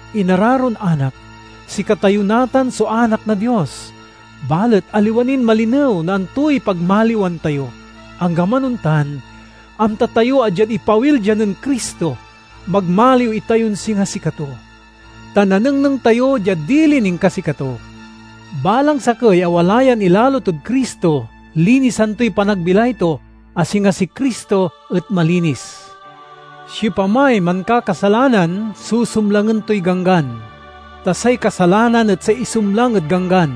Inararon anak, sikatayo natan so anak na Dios, balet aliwa nin malinew no antoy pagmaliwan tayo. Anggaman ontan, amta tayo a diad ipawil dia nen Cristo, magmaliw itayon singa sikato, ta nanengneng tayo diad dilin inkasikato. Balang sakey a wala yan ilalo tod Cristo linisan toy panagbilay to, a singa si Cristo et malinis. Siopamay mankakasalanan susumlangen toy ganggan, ta say kasalanan et say isumlang ed ganggan.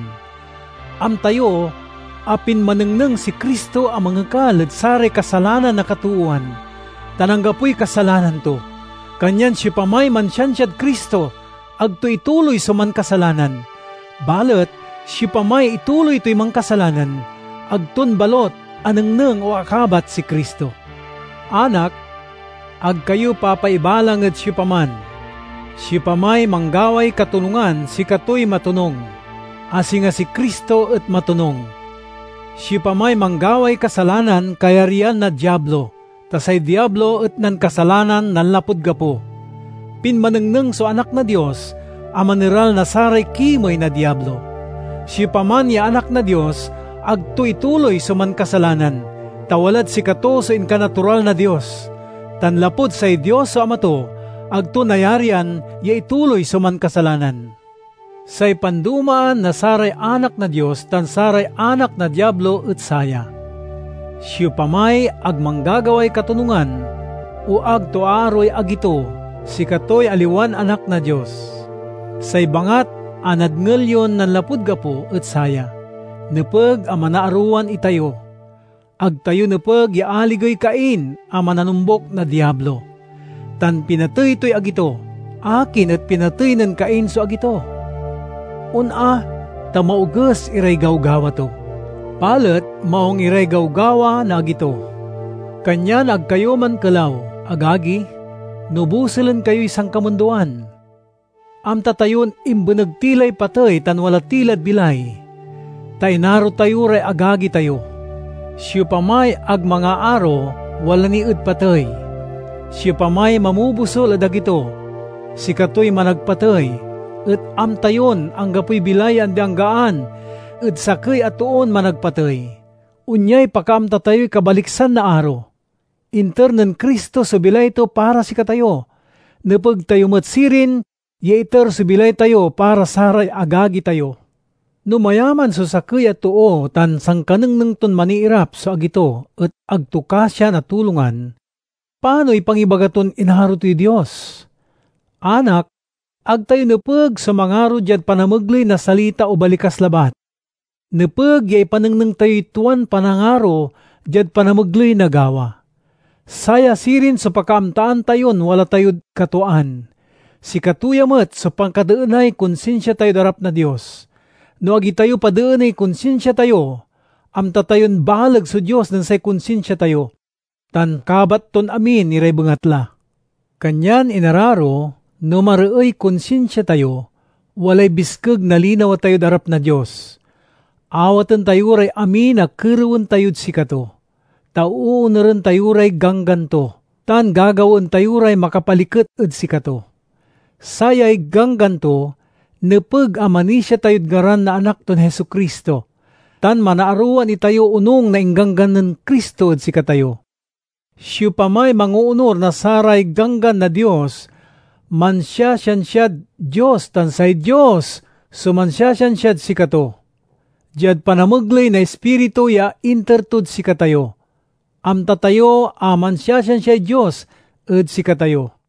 Amta yo a pinmanengneng si Cristo a mangekal ed saray kasalanan na katoowan, tan anggapoy kasalanan to. Kanyan siopamay mansiansiad Cristo ag to ituloy so mankasalanan; balet siopamay ituloy toy mankasalanan ag ton balut anengneng o akabat si Cristo. Anak, ag kayo papaibalang ed siopaman! Siopamay manggaway katonungan sikatoy matonung, a singa si Cristo et matonung Siopamay manggaway kasalanan kayaryan na Diablo, ta say Diablo et nankasalanan nanlapud gapo. Pinmanengneng so Anak na Dios a maneral na saray kimey na Diablo. Siopaman ya anak na Dios ag to ituloy so mankasalanan, ta walad sikato so inkanatural na Dios; tan lapud say Dios so Ama to, ag to nayarian ya ituloy so mankasalanan. Say pandomaan na saray anak na Dios tan saray anak na Diablo et saya: siopamay ag manggagaway katonungan o ag to aaroey agi to, sikatoy aliwan anak na Dios. Say bangat a nadngel yon nanlapud gapo et saya: nepeg a manaarowan itayo. Ag tayo nepeg ya aligey Cain a mananombuk na Diablo, tan pinatey toy agi to. Akin et pinatey nen Cain so agi to? On a, ta maoges iray gawgawa to, balet maung iray gawgawa na agi to. Kanyan ag kayo mankelaw, agagi, no bosulen kayoy sankamundoan. Amta tayon imbeneg ti lay patey tan wala ti lad bilay, ta inaro tayo ray agagi tayo. Siopamay ag mangaaro, wala ni ed patey. Siopamay mamobosul ed agi to, sikatoy managpatey; et amta yon anggapoy bilay ya andi-anggaan ed sakey a toon managpatey. Onyay pakaamta tayoy kabaliksan na aro: inter nen Cristo so bilay to para sikatayo. Nepeg tayo met sirin ya iter so bilay tayo para saray agagi tayo! No mayaman so sakey a too tan sankanengneng ton maniirap so agi to et ag to kasian a tulongan, panoy pangibaga ton inaro toy Dios? Anak! Ag tayo nepeg so mangaro diad panamegley na salita o balikas labat. Nepeg ya ipanengneng tayoy tuan panangaro diad panamegley na gawa. Saya sirin so pakaamtaan tayon wala tayod katwaan. Sikato ya met so pakadeenay konsinsia tayod arap na Dios. No ag itayo padeeney konsinsia tayo, amta tayon baleg so Dios nen say konsinsia tayo, tan kabat ton amin iray bengatla. Kanyan, inararo, no mareey konsinsia tayo, walay biskeg na linawa tayod arap na Dios. Awaten tayo ray amin a kerewen tayod sikato, ta oonuren tayo ray ganggan to tan gagawaen tayo ray makapaliket ed sikato. Sayay ganggan to: nepeg a manisia tayod ngaran na Anak ton Jesu-Cristo, tan manarowan itayo onung na ingganggan nen Cristo ed sikatayo. Siopamay mangoonur na saray ganggan na Dios, mansiasiansiad Dios tan say Dios so mansiasiansiad sikato. Diad panamegley na Ispiritu ya inter tod sikatayo, amta tayo a mansiasiansiay Dios ed sikatayo.